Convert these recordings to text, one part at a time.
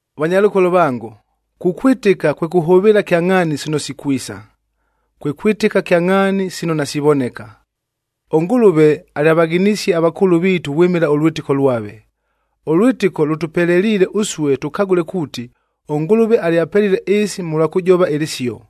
Vanyalʉkolo vango, kukwɨtɨka kwe kʉhʉvɨɨla kyangʼhaani sino sikwisa, kwe kwɨtɨka kyangʼhaani sino nasivoneka. ɄNgʉlʉve alyavaghinisie avakʉʉlʉ viitu vwɨmɨla ʉlwɨtɨko lwave. Ʉlwɨtɨko lʉtʉpeleliile ʉsue tʉkagʉle kuuti, ʉNgʉlʉve alyapelile ɨɨsi mʉlwa kʉjova ɨlɨsio.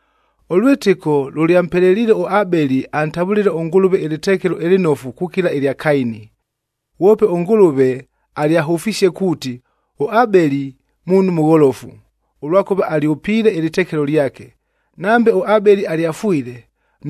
Ʉlwɨtɨko lʉlyampeleliile ʉAbeli antavʉlɨle ʉNgʉlʉve ɨlɨtekelo ɨlɨnofu kukila ɨlya Kaini. Ghwope ʉNgʉlʉve alyahʉfisie kuuti, ʉAbeli muunhu mʉgholofu, ʉlwakʉva alyʉpiile ɨlɨtekelo lyake. Nambe ʉAbeli alyafwile,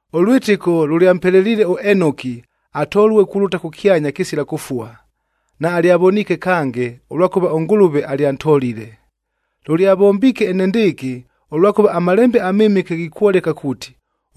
Ʉlwɨtɨko lʉlyampeleliile ʉEnoki atolue kulʉta kʉkyanya kɨsila kʉfua, naalyavoniike kange, ʉlwakʉva ʉNgʉlʉve alyantolile. Lʉlyavombiike enendɨɨkɨ, ʉlwakʉva aMalembe aMɨmɨke ghikwoleka kuuti,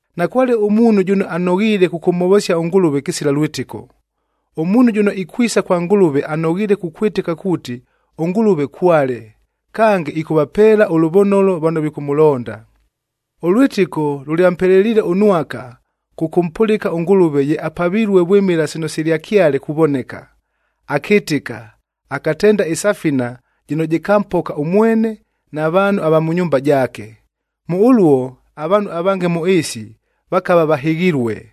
Nakwale ʉmuunhu jʉno anoghiile kʉkʉmhovosia ʉNgʉlʉve kɨsila lwɨtɨko. Ʉmuunhu jʉno ikwisa kwa Ngʉlʉve anoghiile kukwɨtɨka kuuti ʉNgʉlʉve kwale, kange ɨkʉvapeela ʉlʉvonolo vano vikʉmʉlonda. Ʉlwɨtɨko lʉlyampeleliile ʉNwaka kʉkʉmpʉlɨka ʉNgʉlʉve ye apavilue vwɨmɨla sino silyakyale kuvoneka. Akɨtɨka, akatenda ɨsafina jɨno jɨkampoka ʉmwene na vaanhu ava mʉ nyumba jaake. Mʉ ʉluo avaanhu avange mʉ ɨɨsi vakava vahɨghilue,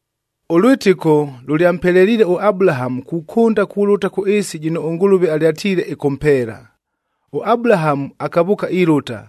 Ʉlwɨtɨko lʉlyampeleliile ʉAbulahamu kukʉnda kulʉta kʉ ɨɨsi jɨno ʉNgʉlʉve alyatiile ɨkʉmpeela. ɄAbulahamu akavʉʉka ilʉta,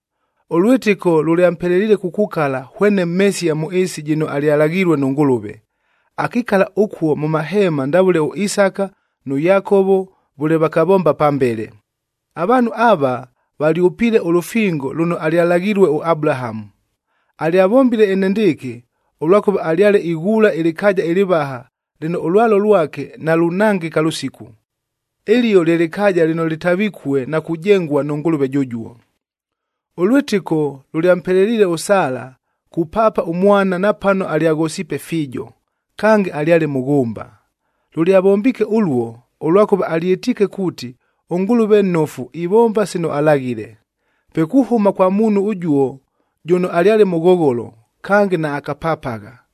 Ʉlwɨtɨko lʉlyampeleliile kukukala hwene mhesia mʉ ɨɨsi jɨno alyalaghilue nʉ Ngʉlʉve. Akikala ʉkuo mʉ maheema ndavʉle ʉIsaka nʉ Yakovo vʉle vakavomba pambele. Avaanhu ava, valyʉpiile ʉlʉfingo lʉno alyalaghilue ʉAbulahamu. Alyavombile enendɨɨkɨ, ʉlwakʉva alyale ighuula ɨlɨkaaja ɨlɨvaha lɨno ʉlwalo lwake nalunangɨka lʉsiku. Ɨlio lye lɨkaaja lɨno lɨtavikue na kujengua nʉ Ngʉlʉve jʉjuo. Ʉlwɨtɨko lʉlyampeleliile ʉSala kupaapa ʉmwana napano alyaghosiipe fiijo, kange alyale mʉghʉmba. Lʉlyavombiike ʉluo, ʉlwakʉva alyɨtiike kuuti ʉNgʉlʉve nnofu ivomba sino alaghile. Pe kuhʉma kwa muunhu ʉjuo jʉno alyale mʉghogholo, kange naakapapagha,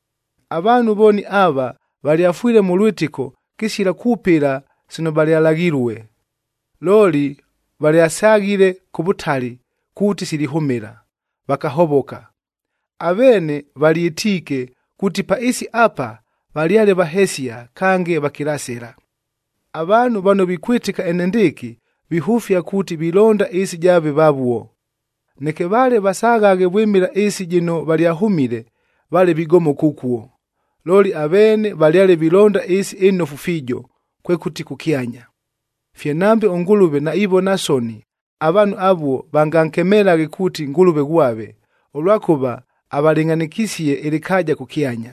Avaanhu vooni ava, valyafwile mʉ lwɨtɨko kɨsila kwʉpɨla sino valyalaghilue. Looli valyasaghile kʉ vʉtali kuuti silihʉmɨla, vakahovoka. Aveene valyɨtiike kuuti pa ɨɨsi apa valyale vahesia kange vakilasɨla. Avaanhu vano vikwɨtɨka enendɨɨkɨ, vihʉfia kuuti vilonda ɨɨsi jaave vavuo. Neke vale vasaghaghe vwɨmɨla ɨɨsi jɨno valyahʉmile, vale vigomoka ʉkuo. Looli aveene valyale vilonda ɨɨsi ɨnofu fiijo, kwekʉti kʉkyanya. Fye nambe ʉNgʉlʉve naivona soni, avaanhu avuo vangankemelaghe kuuti Ngʉlʉve ghwave, ʉlwakʉva avalɨngʼhanɨkisie ɨlɨkaaja kʉkyanya.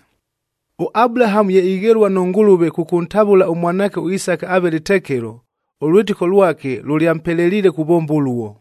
ɄAbulahamu ye ighelua nʉ Ngʉlʉve kʉkʉntavʉla ʉmwanaake ʉIsaka aave lɨtekelo, ʉlwɨtɨko lwake lʉlyampeleliile kuvomba ʉluo.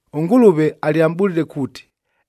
ɄNgʉlʉve alyamʼbʉlile kuuti,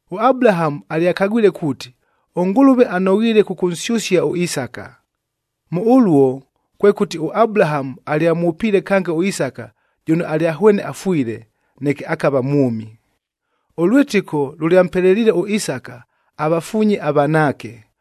ɄAbulahamu alyakagwile kuuti, ʉNgʉlʉve anoghiile kʉkʉnsyʉsia ʉIsaka. Mʉ ʉluo, kwekʉti ʉAbulahamu alyamwʉpiile kange ʉIsaka jʉno alyahwene afwile, neke akava mwʉmi. Ʉlwɨtɨko lʉlyampeleliile ʉIsaka avafuunye avanaake,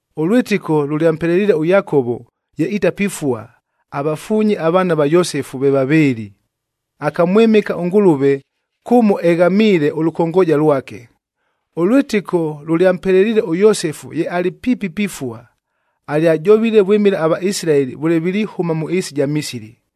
Ʉlwɨtɨko lʉlyampeleliile ʉYakovo ye itapifua, avafuunye avaana va Yosefu ve vavɨɨlɨ.j Akamwɨmɨka ʉNgʉlʉve kʉmo eghamiile ʉlʉkongooja lwake. Ʉlwɨtɨko lʉlyampeleliile ʉYosefu ye alɨ piipi pifua, alyajovile vwɨmɨla aVaisilaeli vʉle vilihʉma mʉ ɨɨsi ɨja Misili,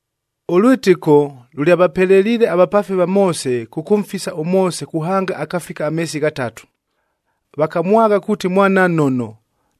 Ʉlwɨtɨko lʉlyavapeleliile avapaafi va Moose kʉkʉmfisa ʉMoose kuhanga akafika ameesi ghatatu. Vakamwagha kuuti mwana nnono,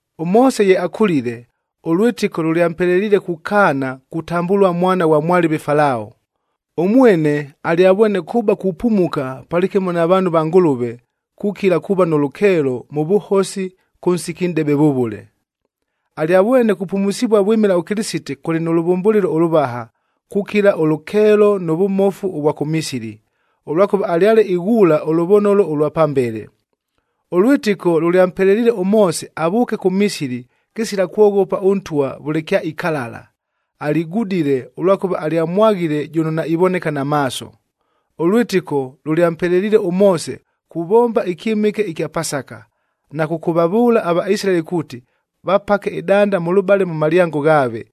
ɄMoose ye akʉlile, ʉlwɨtɨko lʉlyampeleliile kukaana kutambʉlua mwana ghwa mwalɨve Falao. Ʉmwene alyavwene kʉba kupumuka palɨkɨmo na vaanhu va Ngʉlʉve, kukila kuuva nʉ lʉkeelo mʉ vʉhosi kʉ nsiki nʼdebe vʉvʉle. Alyavwene kupumusivua vwɨmɨla ʉKɨlɨsite kʉlɨ nʉ lʉvʉmbʉlɨlo ʉlʉvaha, kukila ʉlʉkeelo nʉ vʉmofu ʉvwa kʉ Misili, ʉlwakʉva alyale ighuula ʉlʉvonolo ʉlwa pambele. Ʉlwɨtɨko lʉlyampeleliile ʉMoose avʉʉke kʉ Misili kɨsila kwoghopa ʉntwa vʉle kyaikalala. Aligudile, ʉlwakʉva alyamwaghile jʉno naivoneka na maaso. Ʉlwɨtɨko lʉlyampeleliile ʉMoose kuvomba ɨkyɨmɨke ɨkya Pasaka, na kʉkʉvavʉʉla aVaisilaeli kuuti vapake ɨdanda mʉlʉbale mʉ malyango ghaave,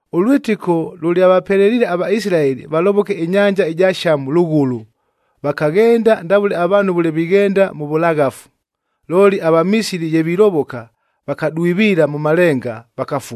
Ʉlwɨtɨko lʉlyavapeleliile aVaisilaeli valovoke ɨnyanja ɨja Shamu lʉghʉlʉ, vakaghenda ndavʉle avaanhu vʉle vighenda mʉ vʉlaghafu. Looli aVamisili ye vilovoka, vakadwiviila mʉ malenga,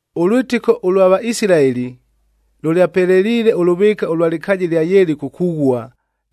Ʉlwɨtɨko ʉlwa Vaisilaeli lʉlyapeleliile ʉlʉvɨɨka ʉlwa lɨkaaja ɨlya Yeliko kughua,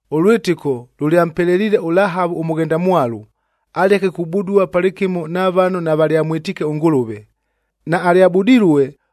Ʉlwɨtɨko lʉlyampeleliile ʉLahavu ʉmʉghendamwalu, aleke kubudua palɨkɨmo na vano navalyamwɨtiike ʉNgʉlʉve. Naalyabudilue,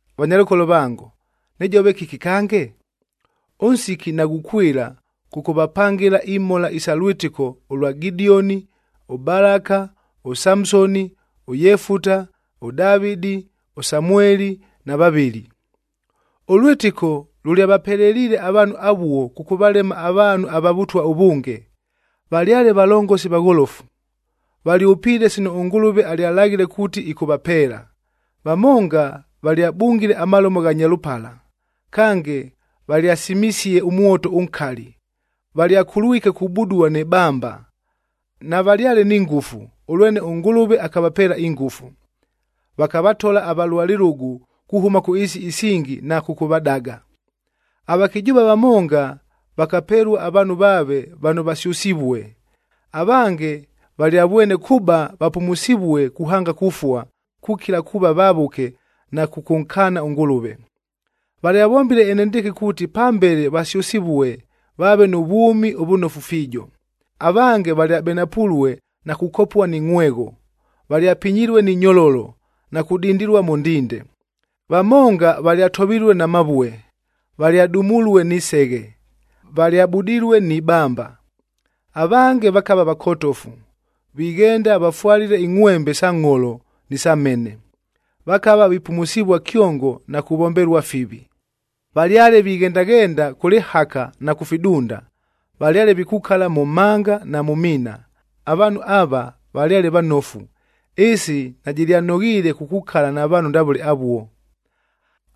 Vanyalʉkolo vango, nɨjove kɨki kange? Ʉnsiki naghukwɨla kʉkʉvapangɨla imhola isa lwɨtɨko ʉlwa Gidioni, ʉBalaka, ʉSamsoni, ʉYefuta, ʉDavɨdi, ʉSamueli na vavɨli. Ʉlwɨtɨko lʉlyavapeleliile avaanhu avuo kʉkʉvalema avaanhu ava vʉtwa ʉvʉnge. Valyale valongosi vagholofu, valyʉpiile sino ʉNgʉlʉve alyalaghile kuuti ɨkʉvapeela. Vamonga valyabungile amalomo gha nyalʉpala. Kange, valyasimisie ʉmwoto ʉnkali, valyakulwike kubudua nɨ bamba. Navalyale ni ngʉfu, ʉlwene ʉNgʉlʉve akavapeela ingʉfu, vakavatola avalua lɨlʉgʉ kuhʉma kʉ ɨɨsi isingi na kʉkʉvadaga. Avakɨjʉʉva vamonga vakapelua avaanhu vaave vano vasyʉsivue. Avange valyavwene kʉba vapumusivue kuhanga kufua, kukila kuuva vavʉke na kʉkʉnkaana ʉNgʉlʉve. Valyavombile enendɨɨkɨ kuuti pambele vasyʉsɨvue, vaave nʉ vwʉmi ʉvʉnofu fiijo. Avange valyabenapulue na kukopua ni ngʼhwegho, valyapinyilue ni nyololo, na kudindilua mʉ ndinde. Vamonga valyatovilue na mavue, valyadumulue ni seghe, valyabudilue ni bamba. Avange vakava vakotofu, vighenda vafwalile ingʼhwembe sa ngʼholo ni sa mhene. Vakava vipumusivua kyongo na kuvombelua fivi. Valyale vighendaghenda kʉ lɨhaka na kʉ fidunda, valyale vikukala mʉ mhanga na mʉ miina. Avaanhu ava, valyale vanofu, ɨɨsi najɨlyanoghiile kukukala na vaanhu ndavʉle avuo.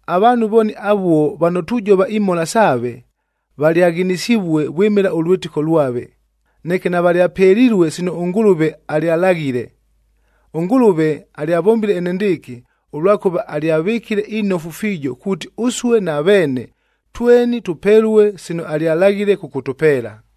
Avaanhu vooni avuo vano tujova imhola saave, valyaghinisivue vwɨmɨla ʉlwɨtɨko lwave, neke navalyapelilue sino ʉNgʉlʉve alyalaghile. ɄNgʉlʉve alyavombile enendɨɨkɨ, ʉlwakʉva alyavɨkile inofu fiijo kuuti ʉsue na veene, tweni tʉpelue sino alyalaghile kʉkʉtʉpeela.